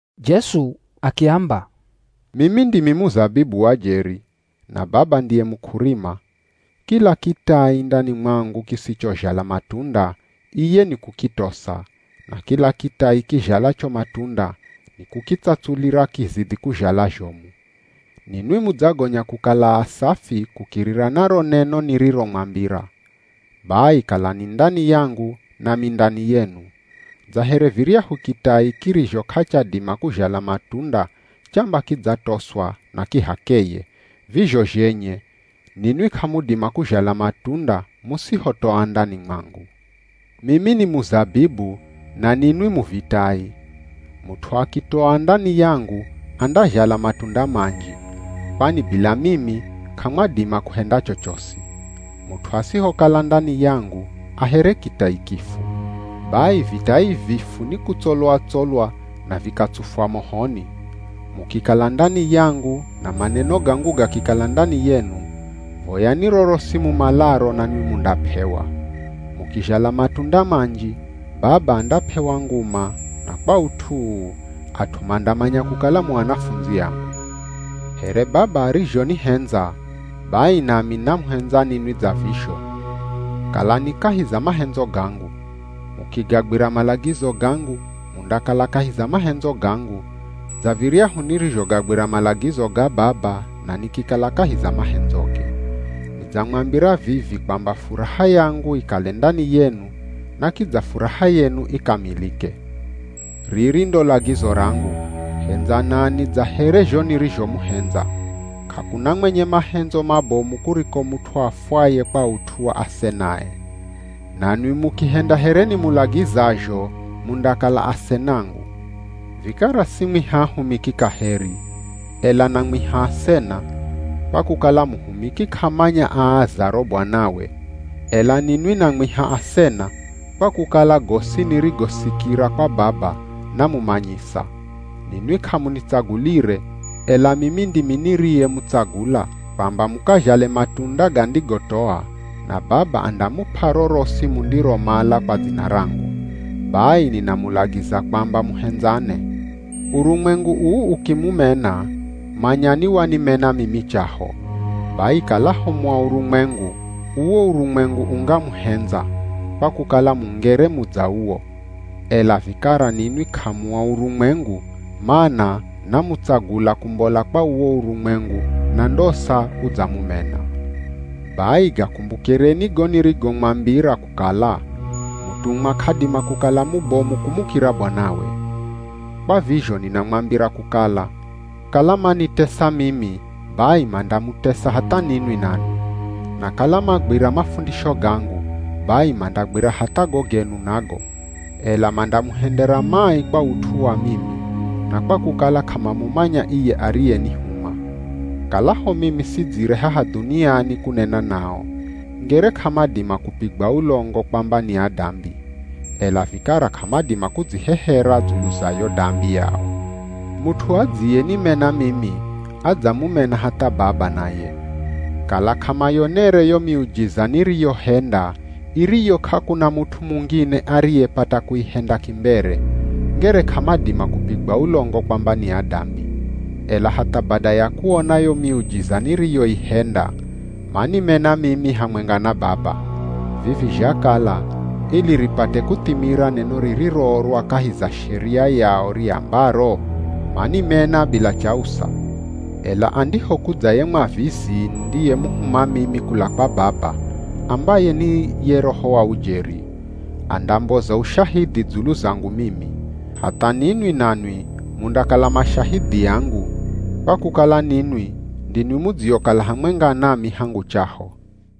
Jesu akiamba, “Mimi ndimi muzabibu wa jeri, na Baba ndiye muk'urima. Kila kitai ndani mwangu kisichozhala matunda, iye ni kukitosa, na kila kitai kizhalacho matunda, ni kukitsatsulira kizidhi kuzhala zhomu. Ninwi mudzagonya kukala asafi kukirira na ro neno niriromwambira. Bai kalani ndani yangu nami ndani yenu. Dza here viryahu kitai kirizho k'achadima kuzhala matunda chamba kidzatoswa na ki h'akeye, vizho zhenye ninwi k'amudima kuzhala matunda musihotoa ndani mwangu. “Mimi ni muzabibu na ninwi mu vitai. Mut'u akitoa ndani yangu andazhala matunda manji, kwani bila mimi, k'amwadima kuhenda chochosi. Mut'u asihokala ndani yangu, a here kitai kifu. Bai vitai vifu ni kutsolwa-tsolwa na vikatsufwa mohoni. Mukikala ndani yangu na maneno gangu gakikala ndani yenu, voyani rorosi mumalaro nanwi mundap'ewa. Mukizhala matunda manji Baba andap'ewa nguma na kwa ut'u uu at'u mandamanya kukala mu anafundzi angu. “Here Baba arizhonihendza, bai nami namuhendza ninwi dza vizho. Kalani kahi za mahendzo gangu. Mukigagwira malagizo gangu, mundakala kahi za mahendzo gangu, dza viryahu nirizhogagwira malagizo ga Baba na nikikala kahi za mahendzoge. Nidzamwambira vivi kwamba furaha yangu ikale ndani yenu na kidza furaha yenu ikamilike. “Riri ndo lagizo rangu: Hendzanani dza here zho nirizhomuhendza. K'akuna mwenye mahendzo mabomu kuriko mut'u afwaye kwa ut'u wa asenae. Nanwi mukihenda here nimulagizazho mundakala asenangu. Vikara simwiha ahumiki kaheri, ela namwiha asena, kwa kukala muhumiki k'amanya aazaro Bwanawe. Ela ninwi namwiha asena, kwa kukala gosi nirigosikira kwa Baba namumanyisa. Ninwi k'amunitsagulire, ela mimi ndimi niriyemutsagula kwamba mukazhale matunda gandigotoa na Baba andamup'a rorosi mundiromala kwa dzina rangu. Bai ninamulagiza kwamba muhendzane.” “Urumwengu uu ukimumena, manyani wanimena mimi chaho. Bai kalaho mu a urumwengu, uwo urumwengu ungamuhendza, kwa kukala mungere mu dza uwo. Ela vikara ninwi k'amua urumwengu, mana namutsagula kumbola kwa uwo urumwengu na ndosa udzamumena. Bai gakumbukireni go nirigomwambira kukala, ‘Mutumwa k'adima kukala mubomu kumukira bwanawe.’ Kwa vizho ninamwambira kukala, kala manitesa mimi bai mandamutesa hatha ninwi nanwi. Na kala magwira mafundisho gangu, bai mandagwira hatha go genu nago. Ela mandamuhendera mai kwa ut'u wa mimi, na kwa kukala k'amamumanya iye ariyenihuma. Kalaho mimi sidzire haha dhuniani kunena nao, ngere k'amadima kupigwa ulongo kwamba ni adambi. Ela vikara k'amadima kudzihehera dzulu za yo dambi yao. Mut'u adziyenimena mimi adzamumena hatha Baba naye. Kala k'amayonere yo miujiza niriyohenda iriyo, k'akuna mut'u mungine ariyepata kuihenda kimbere, ngere k'amadima kupigwa ulongo kwamba ni adambi. Ela hatha bada ya kuona yo miujiza niriyoihenda, manimena mimi hamwenga na Baba. Vivi zhakala ili ripate kuthimira neno ririroorwa kahi za Sheria yao, riambaro, ‘Manimena bila chausa!’ “Ela andihokudza ye Mwavizi, nindiyemuhuma mimi kula kwa Baba, ambaye ni ye Roho wa ujeri, andamboza ushahidhi dzulu zangu mimi. Hatha ninwi nanwi mundakala mashahidhi angu, kwa kukala ninwi ndinwi mudziokala hamwenga nami hangu chaho.